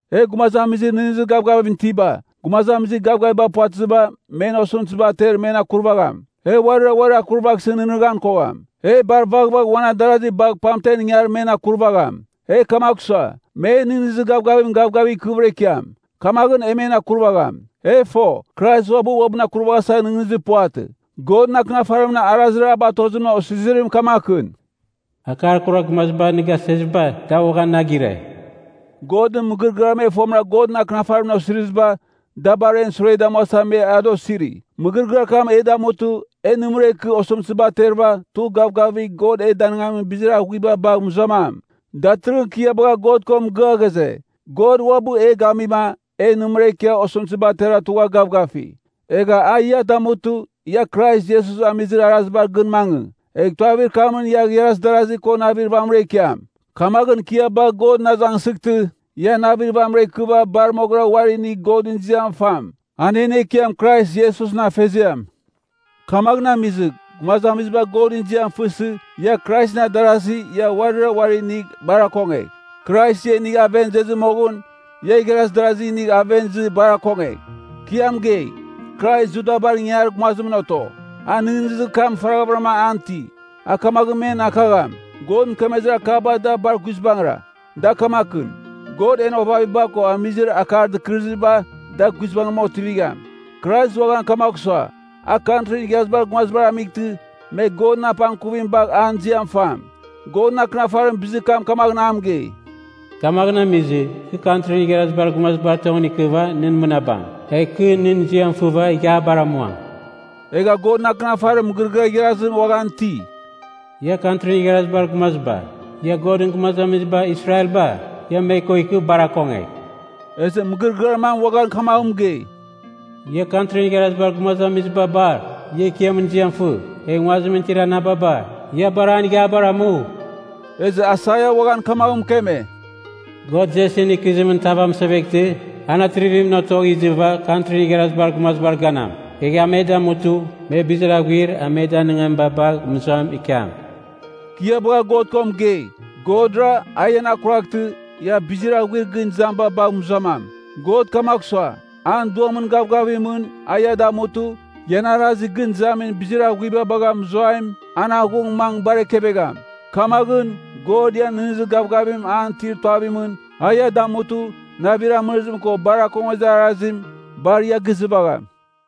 E gumazamizir nɨghnɨzir gavgavim itiba, gumazamizir gavgaviba puvatɨziba, men osɨmtɨziba ater men akurvagham. E uarira uarir akurvaghsɨ nɨghnɨghan kogham. E bar vaghvagh uan adarazi bagh pamten ingar men akurvagham. E kamagh sua, men nɨghnɨzir gavgavim gavgavigh ikɨvɨra ikiam, kamaghɨn e men akurvagham. E fo, Krais uabɨ uabɨn akurvaghasa nɨghnɨzir puvatɨ. Godɨn Akɨnafarimɨn arazir a batozimɨn osizirim kamakɨn, “Akar kurar gumaziba nɨ gaseziba, da uaghan na gire.” Godɨn mɨgɨrɨgɨar me fomɨra Godɨn Akɨnafarimɨn osiriziba, da bar en sure damuasa me ada osiri. Mɨgɨrɨgɨar kam e damutɨ, e nɨmɨra ikɨ, osɨmtɨziba aterɨva tugh gavgavigh God e danɨngamin bizir aghuiba bagh mɨzuamam. Datɨrɨghɨn kɨ ia bagha God ko mɨgɨa ghaze, God uabɨ e gamima, e nɨmɨra ikia osɨmtɨziba atera tugha gavgafi. Egh a ia damutɨ, ia Krais Iesus amizir arazibar gɨn mangɨ, egh tuavir kamɨn ia igharaz darazi ko navir vamɨra ikiam. Kamaghɨn kɨ ia bagh Godɨn azangsɨghtɨ, ia navir vamɨra ikɨva bar moghɨra uari inigh Godɨn ziam fam, an en Ekiam Krais Iesusɨn Afeziam. Kamaghɨn amizɨ, gumazamiziba Godɨn ziam fɨsɨ, ia Kraisɨn adarasi ia uarira uari inigh bar akongegh. Krais ia inigha aven izezɨ moghɨn, ia igharaz darazi inigh aven izɨ bar akongegh. Kɨ ia mɨgei, Krais Judabar ingangarir gumazimɨn oto. A nɨghnɨzir kam faraghavɨram an iti, a kamaghɨn men akagham, God mɨkemezir akaba da bar guizbangɨra. Da kamakɨn, God en ovaviba ko amizir akar dɨkɨrɨziba, da guizbangɨra otivigham. Krais uaghan kamagh sua, a Kantrin Igharazibar Gumazibar amightɨ, me Godɨn apangkuvim bagha an ziam fam. Godɨn Akɨnafarim bizir kam kamaghɨn a mɨgei, “Kamaghɨn amizɨ, kɨ Kantrin Igharazibar Gumazibar tongɨn ikɨva nɨ mɨnabam. Egh kɨ nɨn ziam fɨva ighiabar amuam.” Egha Godɨn Akɨnafarim mɨgɨrɨgɨar igharazim uaghan iti, “Ia Kantrin Igharazibar Gumaziba, ia Godɨn gumazamiziba Israelba, ia me ko ikɨ bar akongegh.” Ezɨ mɨgɨrɨgɨar mam uaghan kamaghɨn mɨgei, “Ia Kantrin Igharazibar Gumazamiziba bar, ia Ekiamɨn ziam fɨ! Egh nguazimɨn itir anababa, ia bar an ighiabar amu!” Ezɨ Aisaia uaghan kamaghɨn mɨkeme, “God Jesin ikɨzimɨn tav amɨseveghtɨ, an atrivimɨn otogh izɨva Kantrin Igharazibar Gumazibar ganam. Egh a me damutɨ, me bizir aghuir a me danɨngamiba bagh mɨzuam ikiam.” Kɨ ia bagha God ko mɨgei, Godra, a ian akuraghtɨ, ia bizir aghuir gɨn izamiba bagh mɨzuamam. God kamagh sua, an Duamɨn gavgavimɨn, a ia damutɨ, ian arazir gɨn izamin bizir aghuiba bagha mɨzuaim, an aghung mangɨ bar ekevegham. Kamaghɨn, God ian nɨghnɨzir gavgavim an itir tuavimɨn, a ia damutɨ, navir amɨrɨzim ko bar akongezir arazim, bar ia gizɨvagham.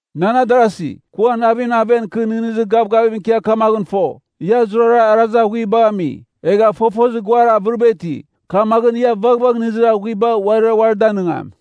Nan adarasi, kɨ uan navimɨn aven kɨ nɨghnɨzir gavgavim ikia kamaghɨn fo, ia zurara arazir aghuibagh ami. Egha fofozir guar avɨriba iti. Kamaghɨn ia vaghvagh nɨghnɨzir aghuiba uarira uari danɨngam.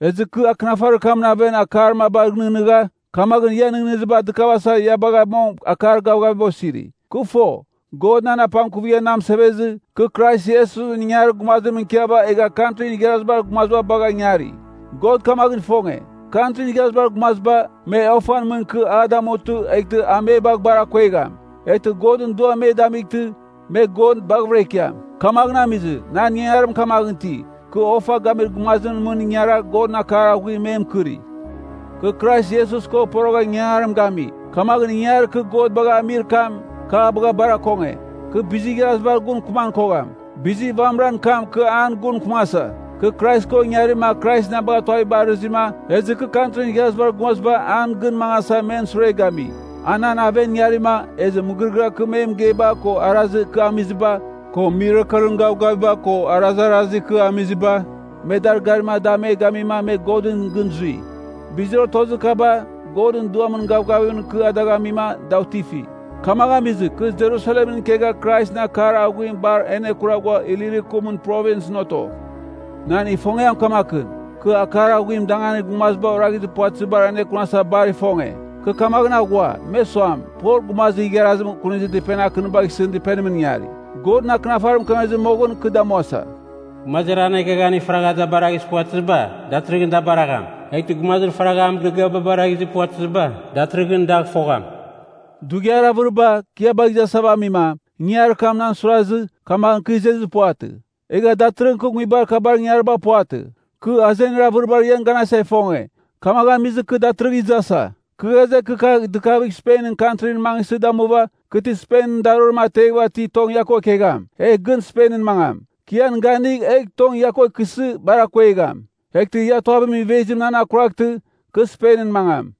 Ezɨ kɨ akɨnafarir kamɨn aven akar mabagh nɨghnɨgha, kamaghɨn ian nɨghnɨziba dɨkavasa ia bagha mong akar gavgaviba osiri. Kɨ fo, God nan apangkuvigha na mɨsevezɨ, kɨ Krais Iesusɨn ingangarir gumazimɨn ikiava egha Kantrin Igharazibar Gumaziba bagha ingari. God kamaghɨn ifonge, Kantrin Igharazibar Gumaziba, me ofan mɨn ikɨ a damutɨ eghtɨ a me bagh bar akongegham. Eghtɨ Godɨn Duam me damightɨ, me God baghɨvɨra ikiam. Kamaghɨn amizɨ, nan ingangarim kamaghɨn iti, kɨ ofa gamir gumazimɨn mɨn ingara Godɨn akar aghuim me mɨkɨri. Kɨ Krais Iesus ko porogha ingangarim gami, kamaghɨn ingangarir kɨ God bagha amir kam, kɨ a bagha bar akonge. Kɨ bizir igharazibar gun mɨkɨman kogham, bizir vamɨran kam kɨ an gun mɨkɨmasa: Kɨ Krais ko ingarima Krais na bagha tuaviba arɨzɨma, ezɨ kɨ Kantrin Igharazibar Gumaziba an gɨn mangasa men sure gami. A nan aven ingarima, ezɨ mɨgɨrɨgɨar kɨ me mɨgeiba ko arazir kɨ amiziba, ko mirakelɨn gavgaviba ko arazarazir kɨ amiziba, me dar garima da me gamima me Godɨn gɨn zui. Bizir otozir kaba, Godɨn Duamɨn gavgavimɨn kɨ a dagh amima da otifi. Kamaghɨn amizɨ, kɨ Jerusalemɨn ikegha Kraisɨn akar aghuim bar anekura ghua Ilirikumɨn Provinsɨn oto. Nan ifongiam kamakɨn: kɨ akar aghuim danganir gumaziba oraghizir puvatɨzibar anekunasa bar ifonge. Kɨ kamaghɨn aghua, me suam, Pol gumazir igharazim kunizir dɨpenir akɨnibagh isɨn dɨpenimɨn ingari. Godɨn Akɨnafarim mɨkemezɨ moghɨn kɨ damuasa, “Gumazir an eghaghaniba faragha da baraghizir puvatɨziba, datɨrɨghɨn da baragham, eghtɨ gumazir faragha an mɨgɨrɨgɨaba baraghizir puvatɨziba, datɨrɨghɨn dagh fogham.” Dughiar avɨriba, kɨ ia bagha izasava amima, ingangarir kam nan suirazɨ, kamaghɨn kɨ izezir puvatɨ. Egha datɨrɨghɨn kɨ nguibar kabar ingangariba puvatɨ. Kɨ azenir avɨribar ian ganasa ifonge, kamaghɨn amizɨ, kɨ datɨrɨghɨn izasa. Kɨ ghaze, kɨ kagh dɨkavigh Spenɨn Kantrin mangɨsɨ damuva, kɨ ti Spenɨn darorim ateghɨva ti tong ia ko ikegham, egh gɨn Spenɨn mangam. Kɨ ian ganigh, egh tong ia ko ikɨsɨ bar akuegham. Eghtɨ ia tuavimɨn ivezim nan akuraghtɨ, kɨ Spenɨn mangam.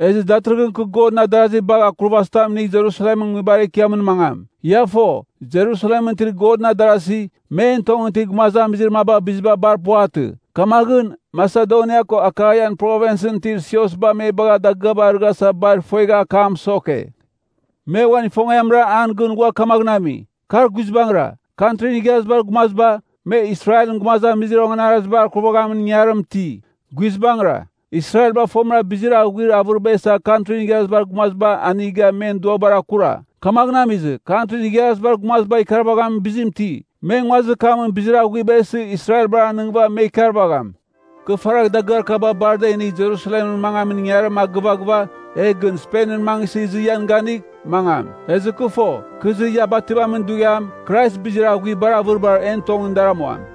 Ezɨ datɨrɨghɨn kɨ Godɨn adarazi bagh akurvazitam inigh Jerusalem Nguibar Ekiamɨn mangam. Ia fo, Jerusalemɨn itir Godɨn adarasi, men tongɨn itir gumazamizir maba biziba bar puvatɨ. Kamaghɨn, Masedonia ko Akaian Provinsɨn itir siosba me bagha dagɨaba arɨghasa bar ifuegha akam mɨsoke. Me uan ifongiamra an gɨn ghua kamaghɨn ami. Kar guizbangɨra, Kantrin Igharazibar Gumaziba, me Israelɨn gumazamizir onganarazibar akurvaghamin ingangarim iti. Guizbangɨra, Israelba fomɨra Godɨn bizir aghuir avɨriba isa Kantrin Igharazibar Gumazibagh aniga men duabar akura. Kamaghɨn amizɨ, Kantrin Igharazibar Gumaziba ikarvaghamin bizim iti, me nguazir kamɨn bizir aghuiba isɨ Israelbar anɨngɨva me ikarvagham. Kɨ faragh dagɨar kaba bar a da inigh Jerusalemɨn mangamin ingangarim a gɨvaghɨva, egh gɨn Spenɨn mangɨsɨ izɨ ian ganigh, mangam. Ezɨ kɨ fo, kɨ izɨ ia bativamin dughiam, Krais bizir aghuir bar avɨribar en tongɨn dar amuam.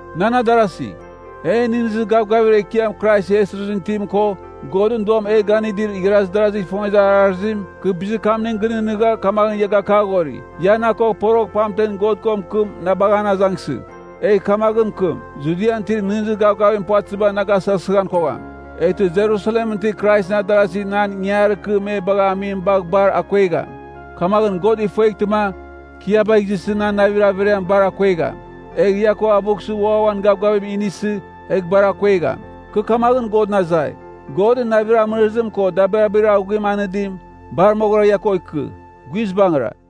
Nan adarasi, en nɨghnɨzir gavgavir Ekiam Krais Iesusɨn itim ko, Godɨn Duam e ganɨdir igharaz darazigh ifongezir arazim, kɨ bizir kamning gɨnɨghnɨgha kamaghɨn ia gakaghori, ia na ko porogh pamtem God ko mɨkɨm na bagh an azangsɨgh. Egh kamaghɨn mɨkɨm, Judian itir nɨghnɨzir gavgavim puvatɨziba na gasɨghasighan kogham. Eghtɨ Jerusalemɨn itir Kraisɨn adarasi nan ingangarir kɨ me bagha amim bagh bar akuegham. Kamaghɨn God ifueghtɨma, kɨ ia bagh izɨsɨ nan navir averiam bar akuegham. Egh ia ko avughsɨ ua uan gavgavim inisɨ, egh bar akuegham. Kɨ kamaghɨn Godɨn azai, Godɨn navir amɨrɨzim ko dabirabir aghuim anɨdim, bar moghɨra ia ko ikɨ. Guizbangɨra.